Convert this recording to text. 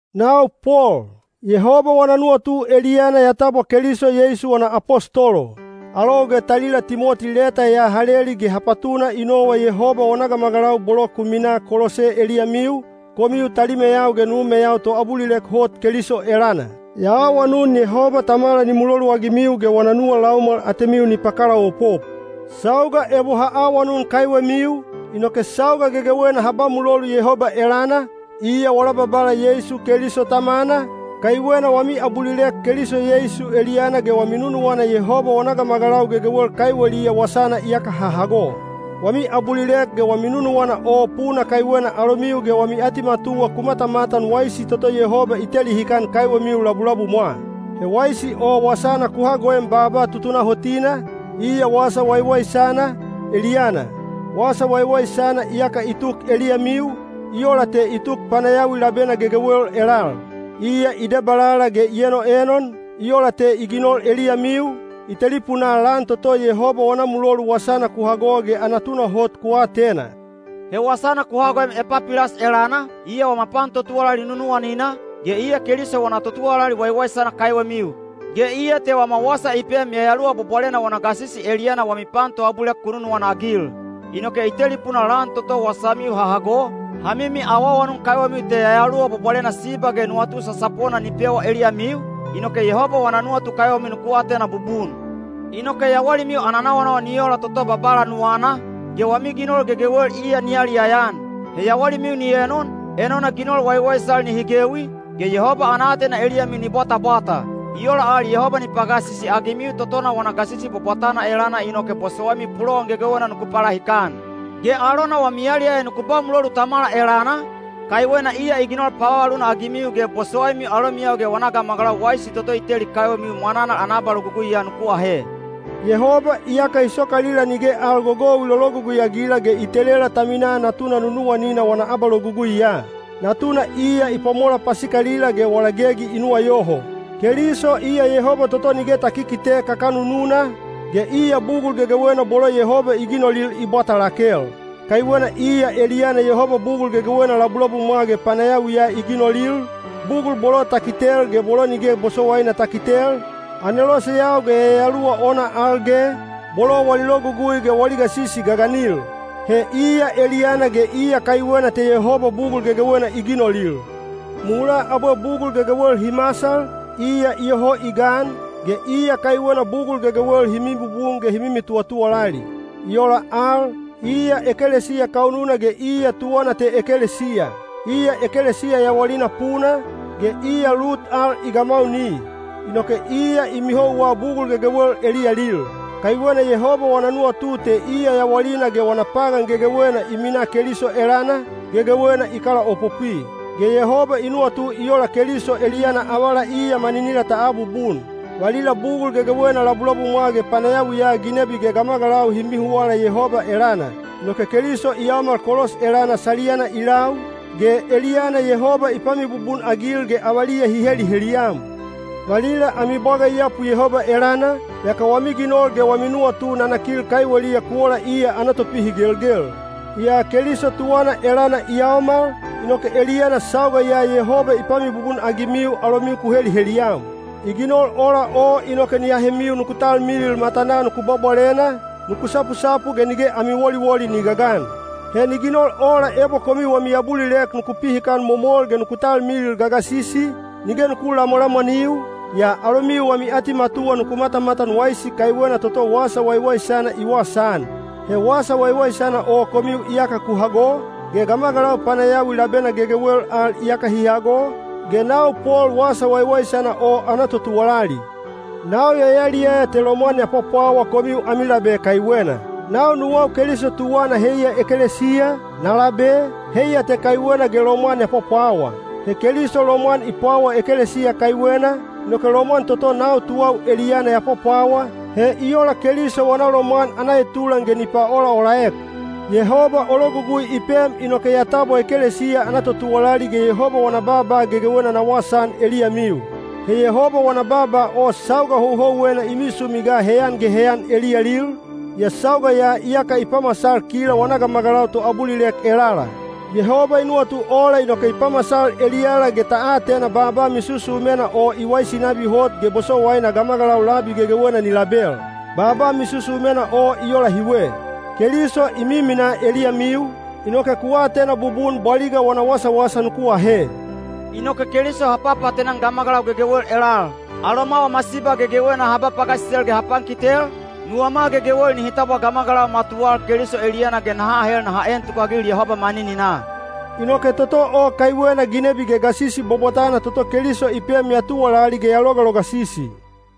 Nau Pol, Yehoba wana nuwatu eliyana ya tabwa Keliso Yeisu wana apostolo. Alou ge talila Timoti leta ya ha leli ge ha patuna i nowa Yehoba wana gamagalau bolo ku minaa Kolose eliyamiu, komiu talimeyau ge numeyau toabulilek hot Keliso elana. Ya awanun Yehoba Tamala ni muloluagimiu ge wana nuwa laumwal atemiu ni pakalaopop. Sauga ebo ha awanun kaiwemiu, inoke sauga gegewena ha ba mulolu Yehoba elana, iya wala Babala Yeisu Keliso Tamana, kaiwena wami abulilek Keliso Yeisu eliyana ge wami nunuwana Yehoba wana gamagalau gegewel kaiweliya wasana iyaka ha hago. Wami abulilek ge wami nunuwana o puna kaiwena alomiu ge wami atimatuwa ku matamatan waisi toto Yehoba i teli hikan kaiwemiu labulabumwa. He waisi o wasana ku hagoem baaba tutunahotina, iya Wasa Waiwaisana, eliyana. Wasa Waiwaisana iyaka i tuk eliyamiu, i ola te i tuk panayawi labena gegewel elal. Iya i debalala ge i enoenon, i ola te i ginol eliyamiu, i telipunaa lan toto Yehoba wana mulolu wasana ku hago ge ana tunahot ku atena. He wasana ku hagoem Epapilas elana, iya wama pan totuwalali nunuwanina, ge iya Keliso wana totuwalali waiwaisana kaiwemiu. Ge iya te wama wasa i pem Yayaluwa Bwabwalena wana gasisi eliyana wami pan toabulilek ku nunuwana-agil. Inoke i telipunaa lan toto wasamiu ha hago, ha mimi awaawanun kaiwemiu te Yayaluwa Bwabwalena siba ge nuwatu sasapona ni pewa eliyamiu, inoke Yehoba wana nuwatu kaiwemiu nuku atena bubun. Inoke yawalimiu ana nawanawa ni ola toto Babala nuwana, ge wami ginol gegewel iya ni yaliyaya-an. He yawalimiu ni enon, enona ginol waiwaisal nihi gewi, ge Yehoba ana aatena eliyamiu ni bwatabwata. I ola al Yehoba ni pagasisi-agimiu totona wana gasisi bwabwatana eliyana inoke bosowaimiu pulowan gegewena nuku palahikan. Ge alona wami yaliyaya nuku ba mulolu Tamala elana, kaiwena iya i ginol pavavaluna-agimiu ge bosowaimiu alomiyau ge wana gamagalau waisi toto i teli kaiwemiu mwananal ana abaloguguiya nuku ahe. Yehoba iyaka i sokalila nige al gogou i lologugui-agila ge i telela ta minaa Natuna nunuwanina wana abaloguguiya. Natuna iya i pwamola pasikalila ge wala gegi i nuwayoho. Keliso iya Yehoba toto nige ta kikite kakanununa, ge iya bugul gegewena bolo Yehoba i ginolil i bwata lakel. Kaiwena iya eliyana Yehoba bugul gegewena labulabumwa ge panayawiya i ginolil, bugul bolo ta kitel ge bolo nige bosowaina ta kitel, aneloseyau ge yayaluwa ona al ge, bolo wali logugui ge wali gasisi gaganil. He iya eliyana ge iya kaiwena te Yehoba bugul gegewena i ginolil. Mulaa abwe bugul gegewel hi masal, iya iyoho i gan, ge iya kaiwena bugul gegewel hi mibubun ge hi mimi tuwatuwalali. I ola al, iya ekelesiya kaununa ge iya tuwana te ekelesiya. Iya ekelesiya yawalina puna, ge iya lut al i gamauni. Inoke iya i mihouwa bugul gegewel eliyalil. Kaiwena Yehoba wana nuwatu te iya yawalina ge wana pagan gegewena i minaa Keliso elana, gegewena i kalaopopwi. Ge Yehoba i nuwatu i ola Keliso eliyana avala iya maninila ta abubun. Valila bugul gegewena labulabumwa ge panayawiya ginebi ge gamagalau hi mihuwala Yehoba elana. Inoke Keliso i yaomal kolos elana saliyana i lau, ge eliyana Yehoba i pamibubun-agil ge avaliya hi heliheliyam. Valila ami bwaga i yapu Yehoba elana, yaka wami ginol ge wami nuwatu nanakil kaiweliya ku ola iya ana topihigelgel. Yaa Keliso tuwana elana i yaomal, inoke eliyana sauga ya Yehoba i pamibubun-agimiu alomiu ku heliheliyam. I ginol ola o inoke ni ahemiu nuku talmilil matanaa nuku bwabwalena, nuku sapusapu ge nige ami woliwoli ni gagan. He ni ginol ola ebo komiu wami abulilek nuku pihikan momol ge nuku talmilil gagasisi, nige nuku lamwalamwaniu, yaa alomiu wami atimatuwa nuku matamatan waisi kaiwena toto Wasa Waiwaisana i wasaan. He Wasa Waiwaisana o komiu iyaka ku hago, ge gamagalau panayawi labena gegewel al iyaka hi hago, ge nau Pol Wasa Waiwaisana o ana totuwalali. Nau ya yaliyaya te lomwan ya pwapwawa komiu ami labe kaiwena. Nau nuwau Keliso tuwana heiya ekelesiya, na labe, heiya te kaiwena ge lomwan ya pwapwawa. He Keliso lomwan i pwawa ekelesiya kaiwena, inoke lomwan toto nau tuwau eliyana ya pwapwawa, he i ola Keliso wana lomwan ana etulan ge ni paolaolaek. Yehoba o logugui i pem inoke ya tabwa ekelesiya ana totuwalali ge Yehoba wana baaba gegewena na wasaan eliyamiu. He Yehoba wana baaba o sauga houhouwena i misumi ga heyan ge heyan eliyalil, yaa sauga ya iyaka i pamasal kila wana gamagalau toabulilek elala. Yehoba i nuwatu ola inoke i pamasal eliyala ge ta atena baaba misusumena o i waisi nabi hot ge bosowaina gamagalau labi gegewena ni label. Baaba misusumena o i ola hiwe: Keliso i miminaa eliyamiu, inoke ku atena bubun bwaliga wana wasawasa nuku ahe. Inoke Keliso ha papaatena-an gamagalau gegewel elal. Aloma wama siba gegewena ha ba pagasisel ge ha pankitel, nuwama gegewel nihi tabwa gamagalau matuwal Keliso eliyana ge naha ahel naha en tukagil Yehoba manininaa. Inoke toto o kaiwena ginebi ge gasisi bwabwatana toto Keliso i pem ya tuwalali ge ya logalogasisi.